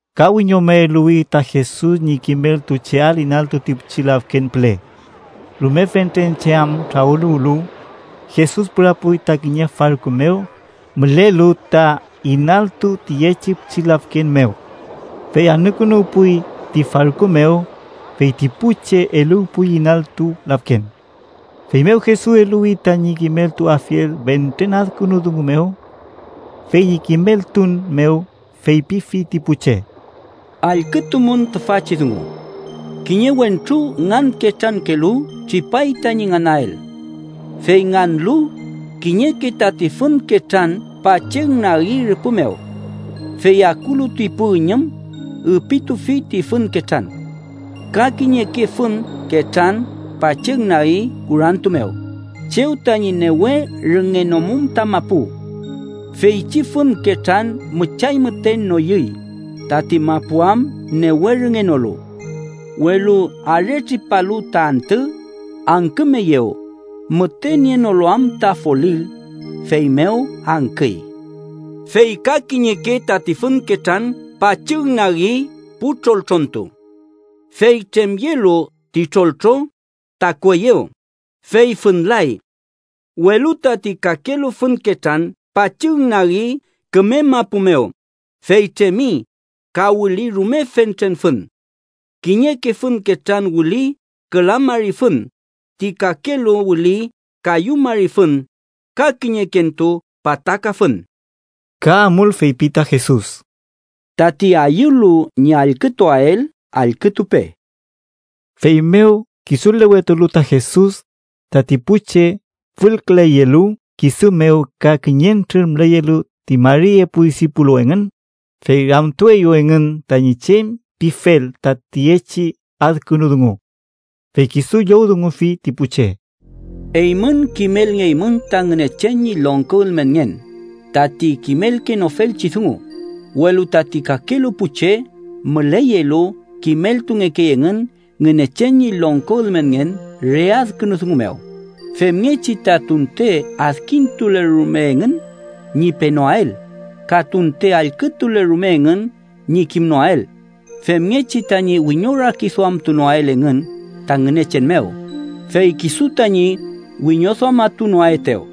Ka wiñome eluwi ta Jesus ñi kimeltucheael inaltu ti pichi lafken püle. Rume fentren che am trawüluwlu, Jesus pürapuy ta kiñe farku mew mülelu ta inaltu tiyechi pichi lafken mew. Fey anükünuwpuy ti farku mew, fey ti pu che eluwpuy inaltu lafken. Feymew Jesus eluwi tañi kimeltuafiel fentren adkünu dungu mew. Fey ñi kimeltun mew feypifi ti pu che: “Allkütumün tüfachi dungu: kiñe wentru nganketrankelu tripay tañi nganael. Fey nganlu, kiñeke tati fün ketran pachügnagi rüpü mew. Fey akulu ti pu üñüm, üpitufi ti fün ketran. Ka kiñeke fün ketran pachügnagi kurantu mew, chew tañi newe rüngenomum ta mapu. Feychi fün ketran müchay müten noyüy, tati mapu am newe rüngenolu. Welu aretripalu ta antü, angkümeyew, müte nienolu am ta folil, feymew angküy. Fey ka kiñeke tati fün ketran pachügnagi pu troltrontu. Fey tremyelu ti troltro, takueyew, fey fünlay. Welu tati kakelu fün ketran pachügnagi küme mapu mew, fey tremi, ka wüli rume fentren fün. Kiñeke fün ketran wüli küla mari fün, ti kakelu wüli kayu mari fün, ka kiñekentu pataka fün.” Ka amul feypi ta Jesus: “Tati ayülu ñi allkütuael, allkütupe.” Feymew kisulewetulu ta Jesus, tati pu che fülküleyelu kisu mew ka kiñentrür müleyelu ti mari epu disipulu engün, fey ramtueyew engün tañi chem pifel ta tiyechi adkünu dungu. Fey kisu llowdungufi ti pu che: “Eymün kimelngeymün ta Ngünechen ñi longko ülmenngen, tati kimelkenofelchi dungu, welu tati kakelu pu che müleyelu kimeltungekey engün Ngünechen ñi longko ülmenngen re adkünu dungu mew, ‘femngechi ta tunte adkintule rume engün, ñi penoael, ka tunte allkütule rume engün ñi kimnoael, femngechi tañi wiñorakiduamtunoael engün ta Ngünechen mew, fey kisu tañi wiñoduamatunoaetew.’”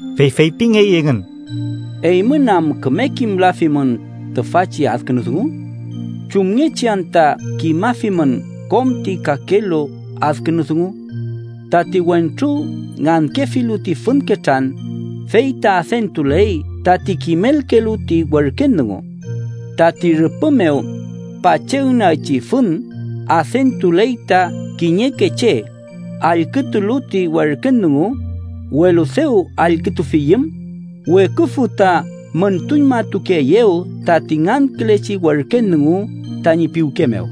Fey feypingey engün: “¿Eymün am küme kimlafimün tüfachi adkünu dungu? ¿Chumngechi anta kimafimün kom ti kakelu adkünu dungu? Tati wentru ngankefilu ti fün ketran, fey ta adentuley tati kimelkelu ti werken dungu. Tati rüpü mew pachügnagchi fün adentuley ta kiñeke che allkütulu ti werken dungu, welu dew allkütufiyüm, weküfü ta müntuñmatukeeyew tati ngankülechi werken dungu tañi piwke mew.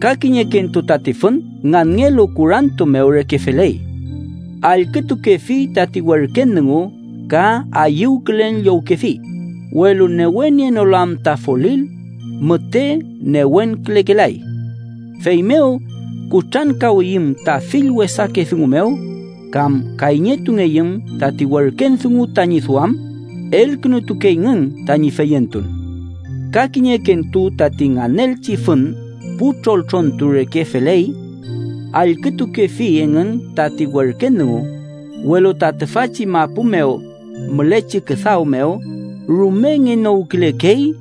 Ka kiñekentu tati fün nganngelu kurantu mew reke feley. Allkütukefi tati werken dungu ka ayüwkülen llowkefi, welu newe nienolu am ta folil, müte newenkülekelay. Feymew kutrankawiyüm ta fill wesake dungu mew, kam kayñetungeyüm tati werken dungu tañi duam, elkünutukeyngün tañi feyentun. Ka kiñekentu tati nganelchi fün pu troltrontu reke feley. Allkütukefi engün tati werken dungu, welu ta tüfachi mapu mew mülechi küdaw mew rume ngenowkülekey,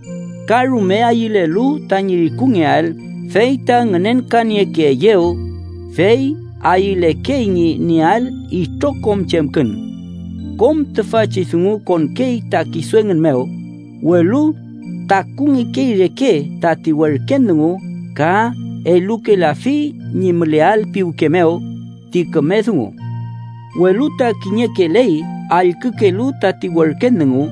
ka rume ayülelu tañi rikungeael fey ta ngünenkaniekeeyew, fey ayülekey ñi nieael itrokom chemkün. Kom tüfachi dungu konkey ta kisu engün mew, welu takungekey reke tati werken dungu ka elukelafi ñi müleael piwke mew ti küme dungu. Welu ta kiñekeley allkükelu tati werken dungu,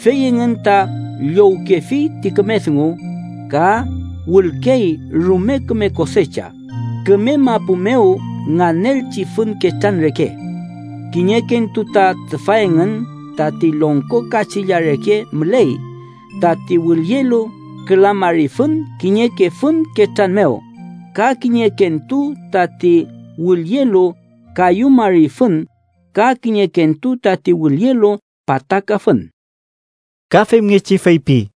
fey engün ta llowkefi ti küme dungu, ka wülkey rume küme kosecha, küme mapu mew nganelchi fün ketran reke. Kiñekentu ta tüfa engün tati longko kachilla reke müley tati wülyelu küla mari fün kiñeke fün ketran mew, ka kiñekentu tati wülyelu kayu mari fün ka kiñekentu tati wülyelu pataka fün.” Ka femngechi feypi: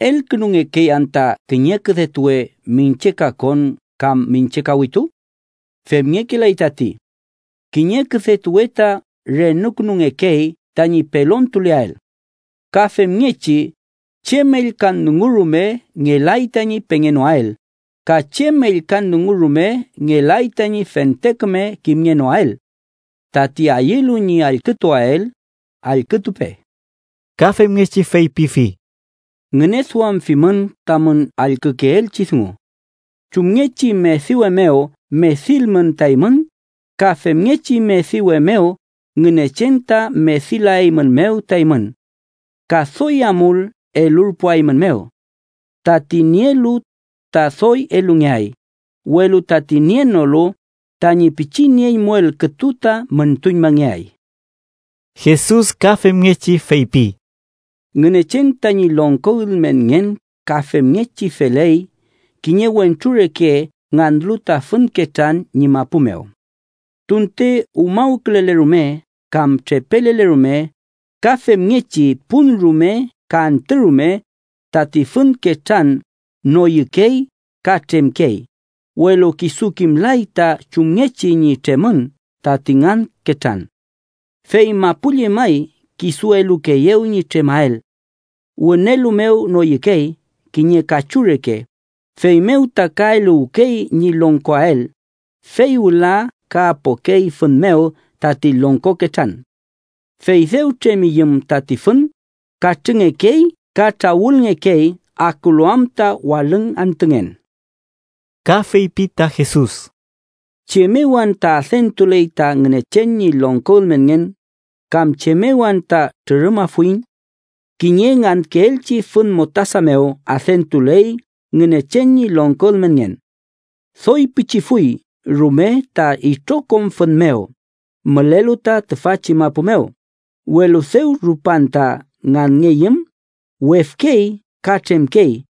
“¿Elkünungekey anta kiñe küdetuwe miñche kakon kam miñche kawitu? Femngekelay tati. Kiñe küdetuwe ta renukünungekey tañi pelontuleael. Ka femngechi, chem ellkan dungu rume ngelay tañi pengenoael, ka chem ellkan dungu rume ngelay tañi fente küme kimngenoael. Tati ayülu ñi allkütuael, allkütupe.” Ka femngechi feypifi: “Ngüneduamfimün tamün allkükeelchi dungu. Chumngechi mediwe mew medilmün ta eymün, ka femngechi mediwe mew Ngünechen ta medilaeymünmew ta eymün. Ka doy amul elurpuaeymünmew. Tati nielu, ta doy elungeay, welu tati nienolu tañi pichi nieñmuel kütu ta müntuñmangeay.” Jesus ka femngechi feypi: “Ngünechen tañi longko ülmenngen ka femngechi feley kiñe wentru reke nganlu ta fün ketran ñi mapu mew: tunte umawkülele rume kam trepelele rume, ka femngechi pun rume ka antü rume, tati fün ketran noyükey ka tremkey, welu kisu kimlay ta chumngechi ñi tremün tati ngan ketran. Fey mapu llemay kisu elukeeyew ñi tremael. Wünelu mew noyükey kiñe kachu reke, feymew ta ka eluwkey ñi longkoael, fey wüla ka apokey fün mew tati longko ketran. Fey dew tremiyüm tati fün, katrüngekey ka trawülngekey akulu am ta walüng antüngen.” Ka feypi ta Jesus: “¿Chem mew anta adentuley ta Ngünechen ñi longko ülmenngen kam chem mew anta trürümafuiñ? Kiñe ngankeelchi fün mostasa mew adentuley Ngünechen ñi longko ülmenngen. Doy pichifuy rume ta itrokom fün mew mülelu ta tüfachi mapu mew, welu dew rupan ta nganngeyüm, wefkey ka tremkey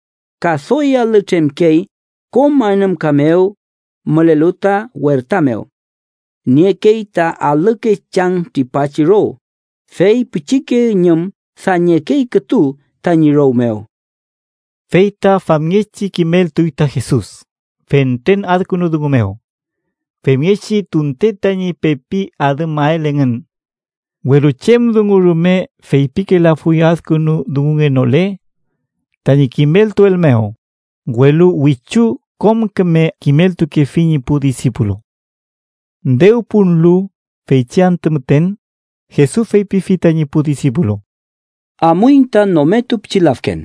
ka doy alü tremkey kom anümka mew, mülelu ta werta mew. Niekey ta alüke chang tripachi row, fey pichike üñüm dañekey kütu tañi row mew.” Fey ta famngechi kimeltuy ta Jesus fentren adkünu dungu mew, femngechi tunten tañi pepi adümael engün. Welu chem dungu rume feypikelafuy adkünu dungunngenole tañi kimeltuel mew, welu wichu kom küme kimeltukefi ñi pu disipulu. Dew punlu feychi antü müten, Jesus feypifi tañi pu disipulu: —Amuiñ ta nometu pichi lafken.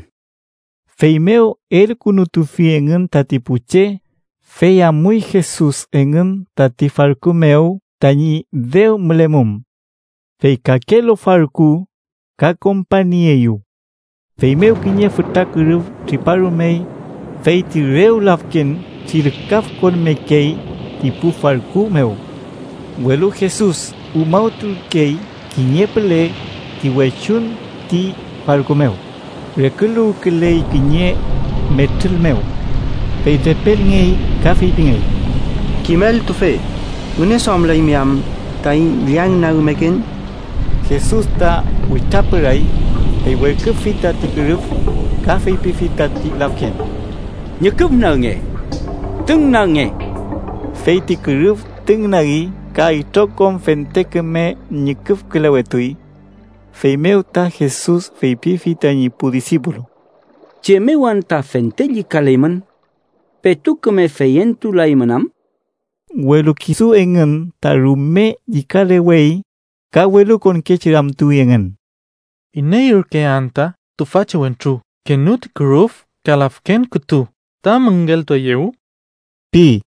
Feymew elkünutufi engün tati pu che, fey amuy Jesus engün tati farku mew tañi dew mülemum. Fey kakelu farku ka kompañnieeyew. Feymew kiñe fütra kürüf triparumey, fey ti rew lafken trilkafkonmekey ti pu farku mew. Welu Jesus umawturkey kiñe püle ti wechuñ ti farku mew, reküluwküley kiñe metrül mew. Fey trepelmengey ka feypingey: —¡Kimeltufe! ¿Ngüneduamlaymi am taiñ llañnagmeken? Jesus ta witrapüray, fey werküfi tati kürüf, ka feypifi tati lafken: —¡Ñüküfnagnge! ¡Tüngnagnge! Fey ti kürüf tüngnagi ka itrokom fente küme ñüküfkülewetuy. Feymew ta Jesus feypifi tañi pu disipulu: —¿Chem mew anta fente llükaleymün? ¿Petu küme feyentulaymün am? Welu kisu engün ta rume llükalewey, ka welukonkechi ramtuwi engün: —¿Iney ürke anta tüfachi wentru kenü ti kürüf ka lafken kütu ta müngeltueyew? ―pi.